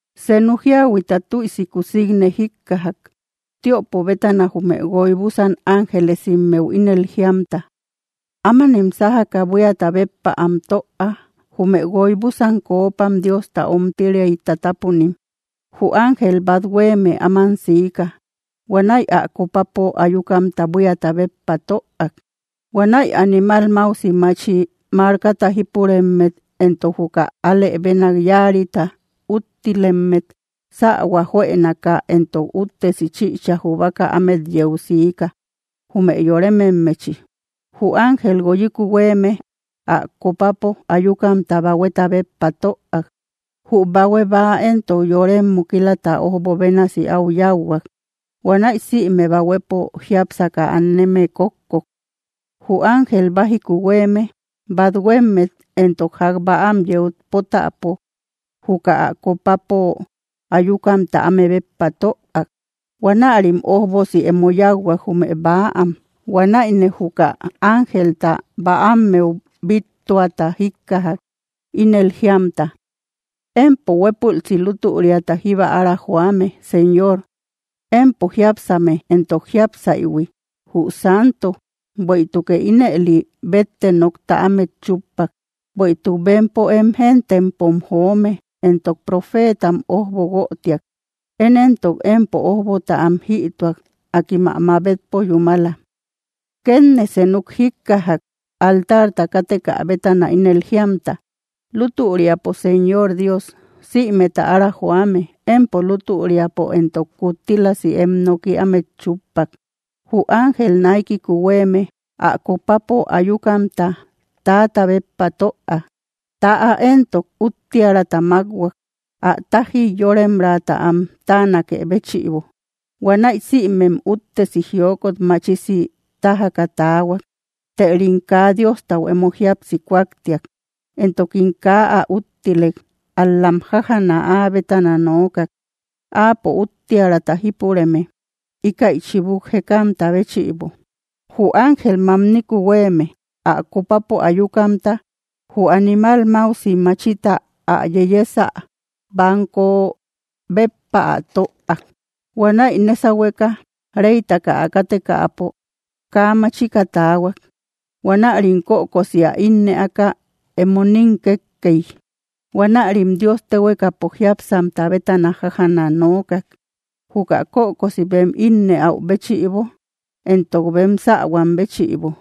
Senu jíahuiata tüisi kusikne jikkajak, tiöpo bétana jume guoy búsan ángelesimmeu ínel jiamta: —Ámanem sájaka buíata béppa am töa, jume guoy búsan coopam Diosta ómtiriay tatápunim. Jü ángel bat huéeme áman siika. Huanäi ä copapo ayukamta buíata béppa töak. Huanäi animal máusi machi markata jípuremmet entok juka alë bénak yáarita úttilemmet sähua juënaka entok úttesi chïcha jubaka ámet yeu siika, jume yorememmechi. Jü ángel guoyiku huéeme ä copapo ayukamta bahueta béppa töak. Jü bahue bäa éntok yorem mukilata ójbo bénasi áu yáuhuak. Huanäi sïme bahuepo jiápsaka aneme kókkok. Jü ángel bájiku huéeme bathuemmet entok ják bäam yeu pótäpo juka ä copapo ayukamta áme béppa töak. Huanärim ójbosi emo yáuhuak, jume bäam. Huanäine juka ángelta bäammeu bíttuata jíkkajak, ínel jíamta: —Empo huépülsi lútüriata jíba ára joame, Señor, Empo jiápsame éntok jiápsaïhui, jü Santo, bueïtukë ínëli bétte nokta ámet chúppak. Bueïtuk bempo em gentepom joome entok profeetam ójbo guötiak; én éntok empo ójbota am jïtuak. Akim ä mabetpo yúmala. Kétne senuk jikkajak altarta kátekä bétana, ínel jíamta: —Lútüriapo Señor Dios, sïmeta ára joame, empo lútüriapo entok kuttílasi em noki ámet chúppak. Jü ángel naikiku huéeme ä copapo ayukamta täata béppa töak. Täa éntok úttiäraata mákhuak, ä tájiy yóremraata am táanakë béchïbo. Huanäi sïmem úttesi jiokot machisi tájaka taahuak. Tërim kaa Diostau emo jíapsi kuaktiak, entokim kaa ä úttilek, ál‑lam jájjana áa bétana nookak, áapo úttiärata jípureme, íkäi chibuk jekamta béchïbo. Jü ángel mamniku huéeme ä copapo ayukamta jü animal máusi machita ä yeyesä banko béppa ä töak. Huanäi nésahueka reytaka ä kátekäpo kaa machika taahuak. Huanärim kökosi ä ínnëaka emo nín kékkey. Huanärim Dios téhuekapo jiápsamta bétana jájana nookak, juka kökosi bem ínnëau béchïbo entok bem sähuam béchïbo.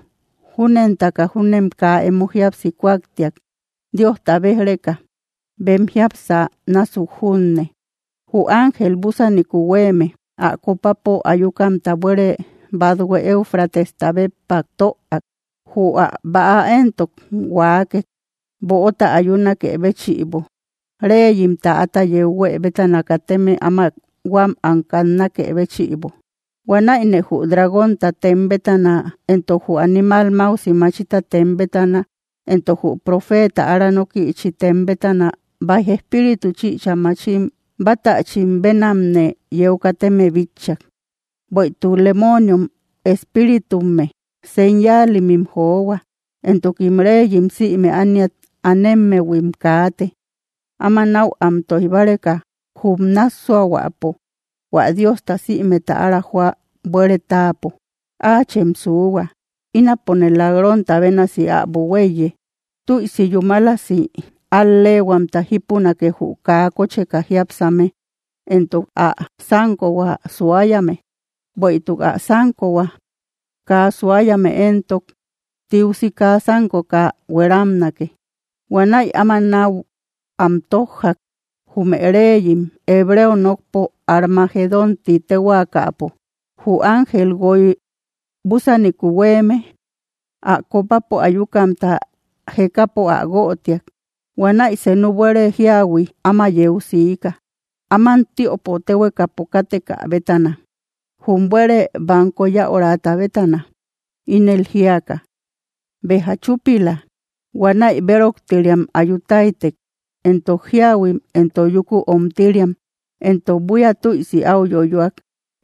Júnentaka júnem kaa emo jíapsi kuaktiak Diosta béj‑reka bem jiapsä násuk junne. Jü ángel búsaniku huéeme ä copapo ayukamta buére bathue Éufratesta béppa töak. Jü ä bäa éntok huaakek, böota ayunakë béchïbo, reyim täata yeu huë bétana kateme áma huám am kannakë béchïbo. Huanäine jü dragónta tem bétana entok jü animal máusi machita tem bétana entok jü profeeta ára nókïchi tem bétana baij espíritu chïcha machim bátächim bénamne yeu kateme bitchak. Bueïtuk lemooniom espíritumme. Señalimim johua, entokim reyim sïme ániat anemmehuim kaate, áma náu am tóij báreka jum nássuahuäpo hua Diosta sïmeta ára joä buére táapo. “¡Áachem suuhua! Ínapone lak‑ronta bénasi äbo huéiye. Tüisi yúmalasi al‑lehuamta jipunake jü kaa kócheka jiápsame entok ä sánkohua suayame. Bueïtuk ä sánkohua kaa suayame éntok, tiusi kaa sánkoka hueramnake.” Huanäi áma náu am tójjak, jume reyim, hebreo nokpo Armagedón ti téhuaakapo. Jü ángel guoy búsaniku huéeme ä copapo ayukamta jekapo ä guötiak. Huanäi senu buére jíahui áma yeu siika, áman tiöpo téhuekapo kátekä bétana, jum buére banko yäurata bétana, ínel jíaka: —¡Béja chúpila! Huanäi béroktiriam ayu táytek, entok jíahuim entok yúku omtiriam; entok buía tüisi áu yoyoak.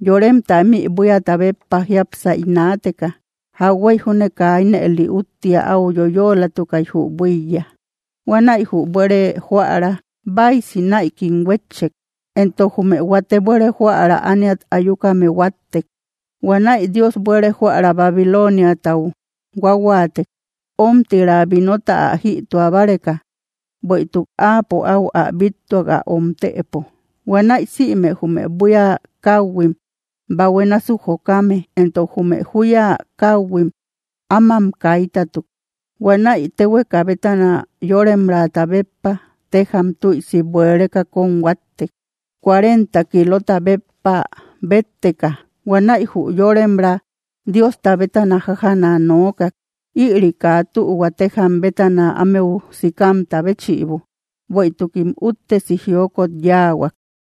Yoremta ímï buíata béppa jiápsay naateka, jauhuey junne kaa ínëli úttia áu yoyoolatukay, jü buíya. Huanäi jü buére jóära báisi näikim huétchek, entok jume huate buére jóära ániat ayukame huáttek. Huanäi Dios buére jóära Babiloniatau huáhuaatek, ómtira vinota ä jïtua báreka, bueïtuk áapo áu ä bíttuak ä omtëpo. Huanäi sïme jume buía káhuim bahue násuk jokame, entok jume júya káuhuim, ámam kaitatuk. Huanäi téhueka bétana yóremrata béppa téjam tüisi buereka kóm huáttek, cuarenta kilota béppa bétteka. Huanäi jü yóremra Diosta bétana jájana nookak, ïri kaa tühua téjam bétana ámeu sikamta béchïbo, bueïtukim úttesi jiokot yáahuak.